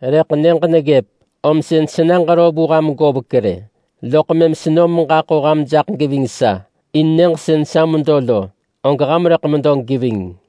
Rëḳ nyëġ neggëp, om sën sena ġero vu ham govek rë, loḳ mëm senom meġaḳo ham jaḳ geving sa in nyëġ sën sa medo lo, og ham rëḳ medo geving.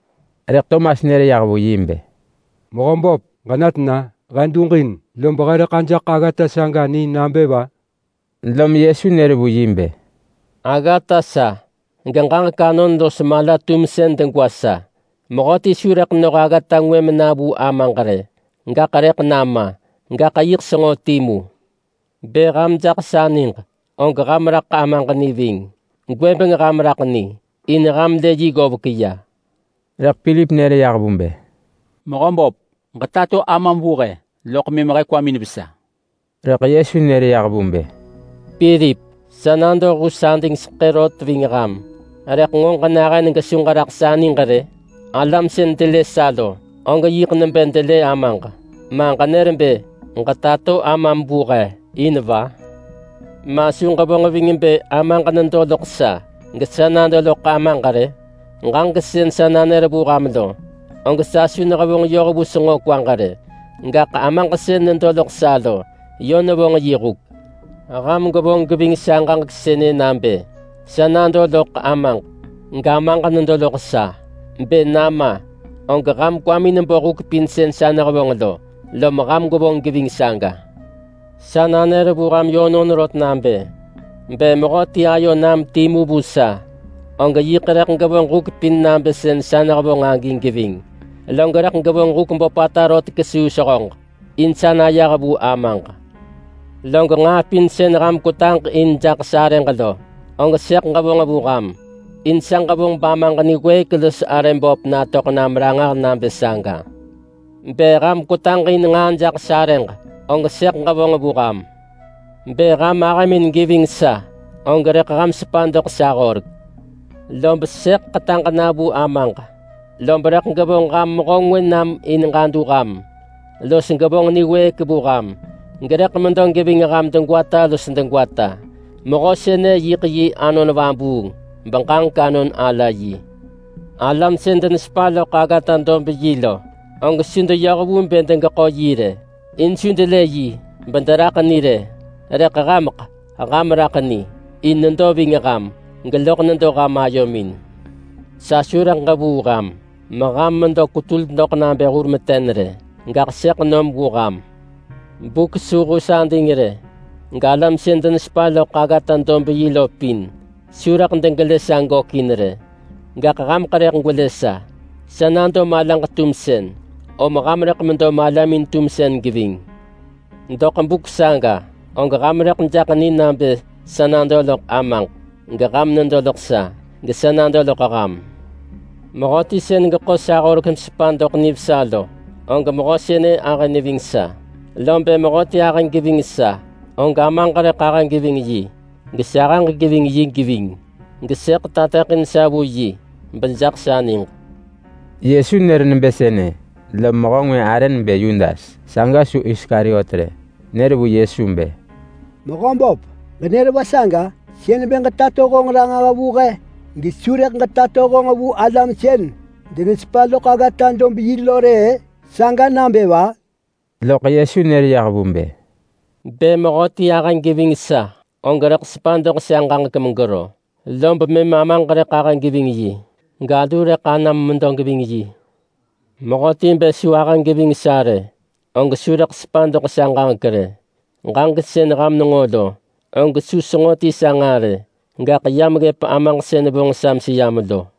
Rëḳ Tomas nër yah vu yi bë, “Mehöböp, ġena tena? He duġin! Lob he rëḳ ajaḳ aggata saga ni nabë va?” Lom Yesu nër vu yi bë, “Aggata sa, geġaġek anon los mala-tumsën degwa sa. Mehöti su rëḳ noh aggata ngwë mena vu Amaġ rë, gaḳ rëḳ nama! Gaḳ yiḳ senġo timu. Bë ham jaḳ sa niġ, og ham raḳ Amaġ ni ving. Gwëbeng ham raḳ ni, in ham lë yi ggovek.” Rëḳ Pilip nër yah vu bë, “Mehöböp, ġetato Amam vu he, loḳ mëm he kwamin vesa.” Rëḳ Yesu nër yah vu bë, “Pilip! Sa nado hus adingseḳë rot ving ham, rëḳ nġo ġenahën gesu ġeraḳ sa niġ rë? Alam sën delë sa lo, og yiḳ nebë delë Amaġ. Ma ġenër bë ‘Ġetato Amam vu he’ in va? Ma su ġevonġ ving bë Amaġ nedo loḳ sa gesa nado loḳ Amaġ rë? Ġaġek sën sa nanër vu ham lo, og sa su nehevonġ yoh vu senġo kwaġ rë, gaḳ Amaġ sën nedo loḳ sa lo yö nevonġ yi huk. Ham gwevonġ geving sa ġaġek sënë nabë sa nado loḳ Amaġ, gAmaġ nedo loḳ sa! Bë nama, og ham kwamin bo huk pin sën sa nehevonġ lo, lom ham gwevonġ geving saga. Sa nanër vu ham yönon rot nabë: Bë mehöti ayo nam timu vu sa, og yiḳ rëḳ gevonġ huk pin nabë sën sa nehevonġ agi geving. Log rëḳ gevonġ huk böpata rot kesuu sehöġ, in sa nayah vu Amaġ. Log nġaa pin sën ham kwetaġ in jaḳ sarëġ lo, og sëḳ ġevonġ vu ham, in sa ġevonġ bAmaġ niwëëk los arë böp natöḳ nam ranġah nabë saga. Bë ham kwetaġ in nġaa jaḳ sarëġ, og sëḳ ġevonġ vu ham.” “Bë ham ahëmin geving sa, og rëḳ ham sepa doḳ sa horek. Lob sëḳ ḳetaġ na vu Amaġ, lob rëḳ gevonġ ham Mehö ngwë nam in ġadu ham los gevonġ niwëëk vu ham, gerëḳ medo geving ham degwata los degwata. Mehö sënë yiḳ yi Anon Vabuung beġaġek anon ala yi. Alam sën denesepa loḳ aggata-dob-yi lo, og su deyoh vu bë degeḳo yi rë, in su delë yi bederaḳ ni rë. Rëḳ hameḳ ham raḳ ni. In nedo ving ham, geloḳ nedo ham ayomin. Sa su rëḳ ġevuu ham meham medo kwetul doḳ nabë hur meten rë. Gaḳ sëḳ nom vu ham. Buk su hus ading rë galam sën denesepa loḳ aggata-dob-yi lo pin su rëḳ degelë sa gökin rë, gaḳ hameḳ rëḳ gwelë sa. Sa nado malaġ-tumsën, om ham rëḳ medo malamin-tumsën geving. Doḳ buk saga og ham rëḳ jaḳ ni nabë sa nado loḳ Amaġ, geham nedo loḳ sa, gesa nado loḳ ham. Mehöti sën geḳo sa horek mesepa doḳ nivesa lo, og mehö sënë ahë neving sa. Lom bë mehöti ahë geving sa, og Amaġ rëḳ ahë geving yi, gesahëġ geving yi geving, gesëḳ tateḳin sa vu yi bejaḳ sa niġ.” Yesu nër nebë sënë, lom mehö ngwë arë nebë Yudas, saga su Iskariot rë, nër vu Yesu bë, “Mehöböp, ġenër va saga? Sën bë ġetato honġ ranġah vu he gesu rëḳ ġetato honġ vu alam sën denesepa loḳ aggata-dob-yi lo rë-ë? Saga nabë va?” Loḳ Yesu nër yah vu bë, “Bë mehöti ahë geving sa, og rëḳ sepa doḳ sa ġaġek megero, lob mëm Amaġ rëḳ ahë geving yi, galu rëḳ anam medo geving yi. Mehöti bë su ahë geving sa rë, og su rëḳ sepa doḳ sa ġaġek rë. Ġaġek sën ham nenġo lo, og su senġo ti sa nġaa rë, gaḳ yam ggëp Amaġ sën vonġ sa meseyam lo.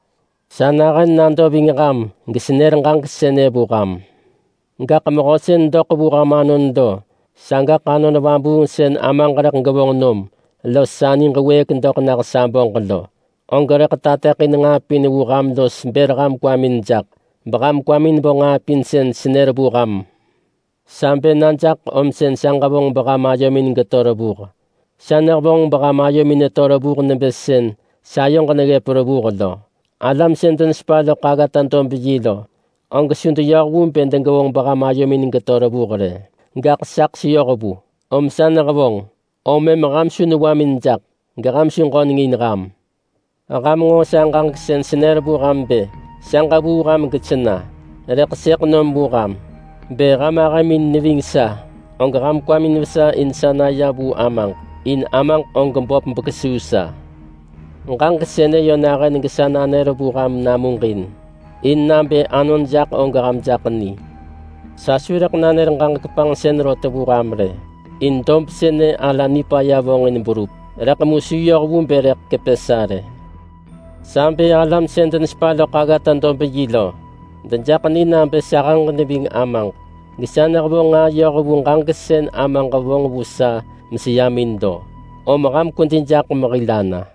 Sa nahën nado ving ham gesenër ġaġek sënë vu ham. Gaḳ Mehö sën doḳ vu ham anon lo, sagaḳ Anon Vabuung sën Amaġ rëḳ gevonġ nom los sa niġ wëëk doḳ nah sa böġ lo, og rëḳ tateḳin nġaa pin vu ham los bër ham kwamin jaḳ beham kwamin bo nġaa pin sën senër vu ham. Sa bë na jaḳ om sa ġevonġ beham ayomin geto revuh. Sa nehevonġ beham ayomin neto revuh nebë sën sayoġ neggëp revuh lo. Alam sën denesepa loḳ aggata-dob-yi lo, og su deyoh vu bë degevonġ beham ayomin geto revuh rë, gaḳ saḳ seyoh vu om sa nehevonġ. Om mëm ham su newamin jaḳ, geham su ġöneng in ham. Ham nġo sa ġaġek sën senër vu ham bë sa ġevuu ham gesena rëḳ sëḳ nom vu ham. Bë ham ahëmin neving sa, og ham kwamin vesa in sa naya vu Amaġ, in Amaġ og böp bekesuu sa. Ġaġek sënë yö nahën gesa nanër vu ham namuġin, in nabë anon jaḳ og ham jaḳ ni. Sa su rëḳ nanër ġaġek panġsën rot vu ham rë, in dob sënë ala nipaya vonġin berup, rëḳ mu su yoh vu bë rëḳ kepë sa rë. Sa bë alam sën denesepa loḳ aggata-dob-yi lo dejaḳ ni nabë sahëġ neving Amaġ, gesa nehevonġ nġaa yoh vu ġaġek sën Amaġ vonġ vu sa meseyam in lo. Om ham kwedi jaḳ mehil ana!”